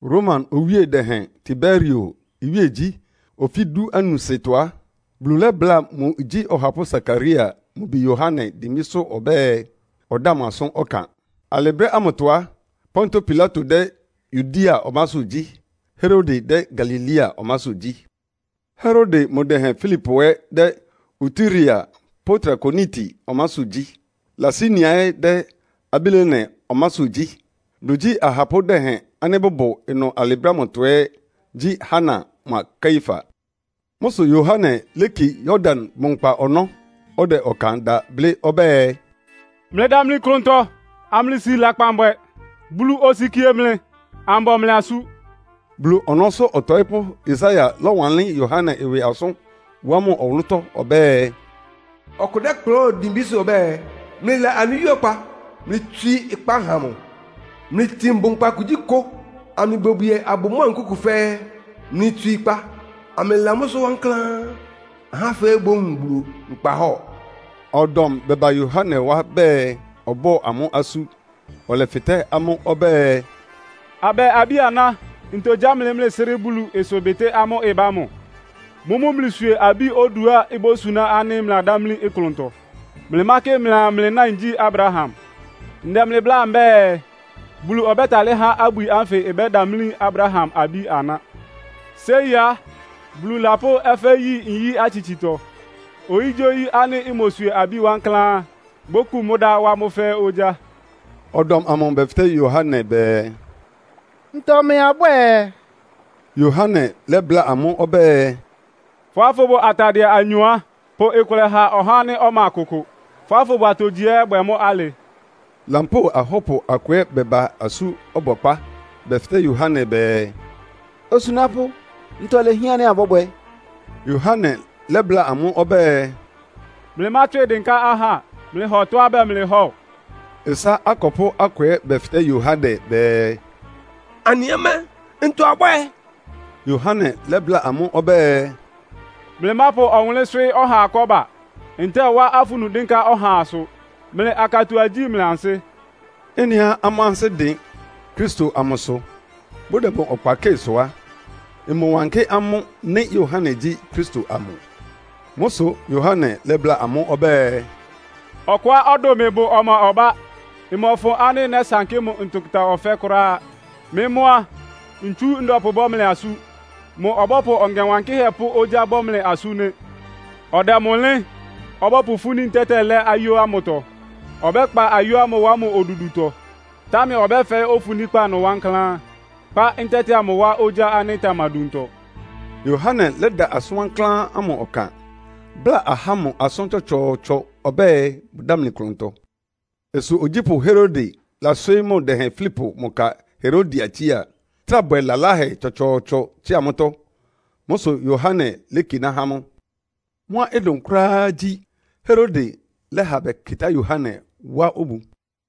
Roma owíe dɛhɛn Tiberio iwíegyí ofí dúanusɩtɔ á, Bulu lɛ́bláa mʋ igyí ɔhapʋ́ Sakaria mʋ bi Yohane dimbísʋ́ ɔbɛ́ɛ, ɔdáa mʋ asʋ́n ɔkan. (Alɩ brɛ́ ámʋtɔ á, Pontio Pilato dɛ́ Yudea ɔmásʋ́ gyí. Herode dɛ́ Galilea ɔmásʋ́ gyí. Herode mʋ dɛhɛn Filipo ɛ́ dɛ́ Iturea pʋ́ Trakoniti ɔmásʋ́ gyí, Lisania ɛ́ dɛ́ Abilene ɔmásʋ́ gyí. Bulu igyí ahapʋ́ dɛhɛn ánɩ́ bʋbʋ ɩnʋ alɩ brɛ́ ámʋtɔ ɛ́ gyí Hana mʋa Kaiafa.) Mʋ́ sʋ Yohane léki Yordan bʋnkpa ɔnɔ́, ɔdɛ ɔkan da blɩ́ ɔbɛ́ɛ, “Mlɩdamli klʋntɔ, amlɩsi lakpan bwɛ. Bulu osikie mlɩ, ambɔ mlɩ asú.” Bulu ɔnɔ́sʋ́ ɔtɔɩ́pʋ́Yesaia lɔ́wanlɩ́n Yohane ɩwɩ asʋ́n wá mʋ ɔwʋlʋ́tɔ́ ɔbɛ́ɛ, “Ɔkʋ dɛ́kplʋn dimbísʋ́ ɔbɛ́ɛ, ‘Mlɩla anɩ Wíe ɔkpa. Mlɩtswii ɩkpa ha mʋ! Mlɩtin bʋnkpa kugyíkʋ, amlɩbwiebwie abʋ mʋ́a nkúku fɛ́ɛ́. Mlɩtswíi ɩkpa, amlɩla mʋ́sʋ́ wankláán. Ahá fɛ́ɛ́ bówun Bulu nkpahɔ́ɔ.’” Ɔdɔm bɛba Yohane wá bɛɛ, ɔbɔ́ amʋ́ asú. Ɔlɛfɩtɛ́ amʋ ɔbɛ́ɛ, “Abɛ abí-aná, ntɔ gyá mlɩ, mlɩsrɩ́ Bulu ɩsʋbɩtɩ́ ámʋ́ʋ́ ɩbá ámʋ? Mʋ́mʋ́ mlɩswie abí oduá ibósuná ánɩ́ lɛ́lɛ́ mlɩladámlí klʋntɔ. Mlɩmákɩ mlɩaa, mlɩ náin gyí Abraham. Ndɛ mlɩ bláa mbɛ́ɛ, Bulu ɔbɛ́talɩ́ há abwi ánfɩ ɩbɛ́damlí Abraham abí-aná. Séi á, Bulu lapʋ́ ɛfɛ́ yi nyí-atsitsitɔ. Oyígyíoyí ánɩ́ imoswie abi wankláán á, bókun mʋ́ dá, wá mʋ́ fɛ́ɛ́ ogyá.” Ɔdɔm amʋ bɛfɩtɛ́ Yohane bɛɛ, “Ntɔ mɛɛ abwɛ́ɛ?” Yohane lɛ́bláa amʋ́ ɔbɛ́ɛ, “Fʋ́á fʋbʋ atadɩɛ anyɔ á, pʋ kʋlɛ ha ɔhá ánɩ́ ɔma kʋkʋ. Fʋ́á fʋbʋ atogyihɛ ɛ́ bwɛ mʋ́ alɩ.” Lampóo ahɔ́pʋ akʋ ɛ́ bɛba asú ɔbɔkpá. Bɛfɩtɛ́ Yohane bɛɛ, “Osunápʋ́, ntɔ ilehián ánɩ́ abɔ́bwɛ?” Yohane lɛ́bláa amʋ́ ɔbɛ́ɛ, “Mlɩmátswɩ dɩnká ahá. Mlɩhɔ tɔ́á bɛɛ mlɩhɔ́ɔ.” Ɩsá akɔpʋ́ akʋ ɛ́ bɛfɩtɛ́ Yohane bɛɛ, “Anɩ ɛ́ mɛ́, ntɔ abwɛ́ɛ?” Yohane lɛ́bláa amʋ́ ɔbɛ́ɛ, “Mlɩmápʋ ɔwʋnlɩ́n swɩ́ɩ́ ɔhaa kɔ́ba, ntɛ́ɛ wá afunu dɩ́nká ɔhaasʋ. Mlɩ akatua igyí mlɩ ansɩ́.” Ɩ́nɩá amʋ́ ansɩ́ dɩn Kristo amʋsʋ, bʋdɛ mʋ ɔkpa kɩ́ɩ sʋ á, ɩmɔwánkɩ́ amʋ́ nɩ́ Yohane gyí Kristo amʋ. Mʋ́ sʋ Yohane lɛ́bláa amʋ́ ɔbɛ́ɛ, “Ɔkʋá ɔdʋn mɩ bʋ ɔma ɔbá. Mmɔfʋn ánɩ́ nɛ́sankɩ́ mʋ ntʋkʋta ɔfɛ́ kʋ́ráá. Mɩ́ mʋ́ á, ntsu ndɛpʋbɔ́ mlɩ asú. Mʋ ɔbɔ́pʋ Ɔŋɛ Wankɩ́hɛ́ pʋ́ ogyá bɔ́ mlɩ asú nɩ́. Ɔdɛ mʋ ɩlɩ́n, ɔbɔ́pʋfúní ntɛ́tɛ lɛ́ ayó ámʋtɔ. Ɔbɛ́kpa ayó ámʋ wá mʋ odudutɔ. Támɛ ɔbɛ́fɛɩ́ ofuníkpá ɩnʋ wankláán, kpá ntɛ́tɛ amʋ wá ogyá ánɩ́ ɩtamaduntɔ.” Yohane lɛ́da asʋn wankláán ámʋ ɔkan, bláa ahá ámʋ asʋ́n tsɔtsɔɔtsɔ ɔbɛ́ɛ, bʋdámli klʋntɔ. Ɩsʋ ogyípʋ́ Herode laswɩɩ́ mʋ dɛhɛn Filipo mʋ ka Herodia tsía, trá bwɛ lalahɛ tsɔtsɔɔtsɔ tsɩ́a mʋ́tɔ́. Mʋ́ sʋ Yohane lékiná há mʋ. Mʋ́á ɩdʋn kʋ́ráá gyí, Herode lɛ́ha bɛkɩtá Yohane wá obu.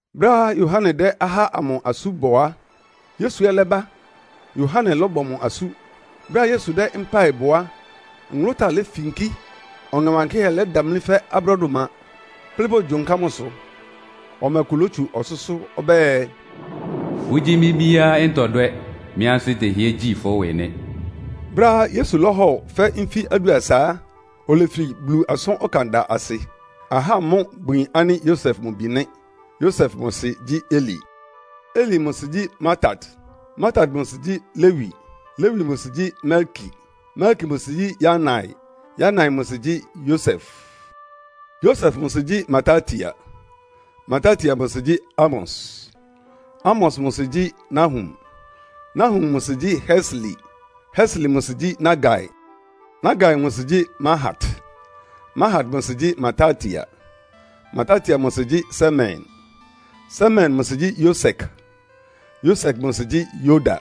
Brɛ́á Yohane dɛ́ ahá ámʋ asú bɔ á, Yesu ɛ́ lɛ́ba, Yohane lɔ́bɔ mʋ asú. Brɛ́á Yesu dɛ́ mpáɩ bɔ á, nwʋlʋ́táa lefinkí, Ɔŋɛ Wankɩ́hɛ́ lɛ́damlí fɛ́ abrɔ́dʋma, kplɩ́ bogyonká mʋsʋ. Ɔmɛ kʋ lotsu ɔsʋ́sʋ́ ɔbɛ́ɛ, “Fʋ́gyí mɩ́ bíá ntɔdwɛ́, mɩ ansɩ́ tɛhɩ́ɛ́ gyi fʋ́ ɩwɩ nɩ́.” Brɛ́á Yesu lɔ́hɔ fɛ́ nfí adʋasa á, olefi Bulu asʋ́n ɔkanda asɩ. Ahá mʋ́ bʋyin ánɩ́ Yosef mʋ bi nɩ́. Yosef mʋ sɩ gyí Eli. Eli mʋ sɩ gyí Martat. Martat mʋ sɩ gyí Lewi. Lewi mʋ sɩ gyí Melki. Melki mʋ sɩ gyí Yanai. Yanai mʋ sɩ gyí Yosef. Yosef mʋ sɩ gyí Martatia. Martatia mʋ sɩ gyí Amos. Amos mʋ sɩ gyí Nahum. Nahum mʋ sɩ gyí Hesli. Hesli mʋ sɩ gyí Nagai. Nagai mʋ sɩ gyí Mahat. Mahat mʋ sɩ gyí Martatia. Martatia mʋ sɩ gyí Semein. Semein mʋ sɩ gyí Yosek. Yosek mʋ sɩ gyí Yoda.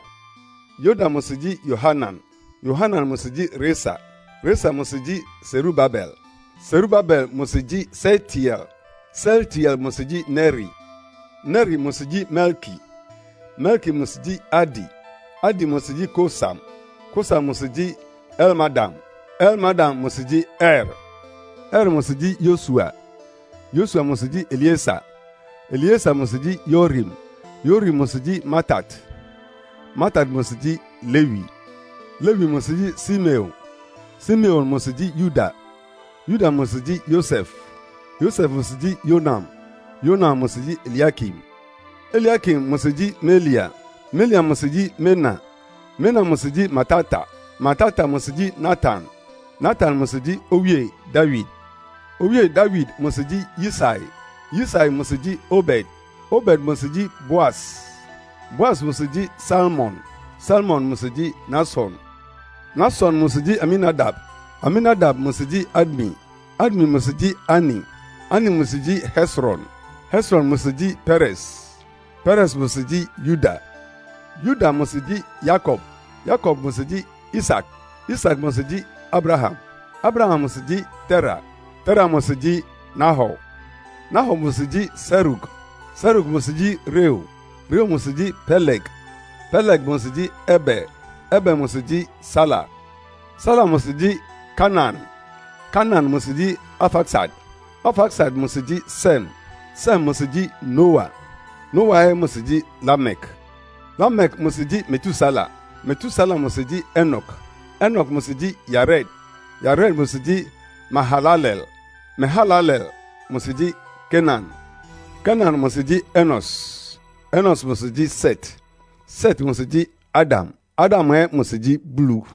Yoda mʋ sɩ gyí Yohanan. Yohanan mʋ sɩ gyí Resa. Resa mʋ sɩ gyí Serubabel. Serubabel mʋ sɩ gyí Sealtiel. Sealtiel mʋ sɩ gyí Neri. Neri mʋ sɩ gyí Melki. Melki mʋ sɩ gyí Adi. Adi mʋ sɩ gyí Kosam. Kosam mʋ sɩ gyí Elmadam. Elmadam mʋ sɩ gyí Er. Er mʋ sɩ gyí Yosua. Yosua mʋ sɩ gyí Elieser. Elieser mʋ sɩ gyí Yorim. Yorim mʋ sɩ gyí Martat. Martat mʋ sɩ gyí Lewi. Lewi mʋ sɩ gyí Simeon. Simeon mʋ sɩ gyí Yuda. Yuda mʋ sɩ gyí Yosef. Yosef mʋ sɩ gyí Yonam. Yonam mʋ sɩ gyí Eliakim. Eliakim mʋ sɩ gyí Melea. Melea mʋ sɩ gyí Mena. Mena mʋ sɩ gyí Martata. Martata mʋ sɩ gyí Natan. Natan mʋ sɩ gyí Owíe Dawid. Owíe Dawid mʋ sɩ gyí Yisai. Yisai mʋ sɩ gyí Obed. Obed mʋ sɩ gyí Boas. Boas mʋ sɩ gyí Salmon. Salmon mʋ sɩ gyí Nahson. Nahson mʋ sɩ gyí Aminadab. Aminadab mʋ sɩ gyí Admin. Admin mʋ sɩ gyí Arni. Arni mʋ sɩ gyí Hesron. Hesron mʋ sɩ gyí Peres. Peres mʋ sɩ gyí Yuda. Yuda mʋ sɩ gyí Yakob. Yakob mʋ sɩ gyí Isak. Isak mʋ sɩ gyí Abraham. Abraham mʋ sɩ gyí Tera. Tera mʋ sɩ gyí Nahor. Nahor mʋ sɩ gyí Serug. Serug mʋ sɩ gyí Reu. Reu mʋ sɩ gyí Peleg. Peleg mʋ sɩ gyí Eber. Eber mʋ sɩ gyí Sala. Sala mʋ sɩ gyí Kainan. Kainan mʋ sɩ gyí Arfaksad. Arfaksad mʋ sɩ gyí Sem. Sem mʋ sɩ gyí Noa, Noa ɛ́ mʋ sɩ gyí Lamek. Lamek mʋ sɩ gyí Metusela. Metusela mʋ sɩ gyí Enok. Enok mʋ sɩ gyí Yared. Yared mʋ sɩ gyí Mehalaleel. Mehalaleel mʋ sɩ gyí Kenan. Kenan mʋ sɩ gyí Enos. Enos mʋ sɩ gyí Set. Set mʋ sɩ gyí Adam. Adam ɛ́ mʋ sɩ gyí Bulu.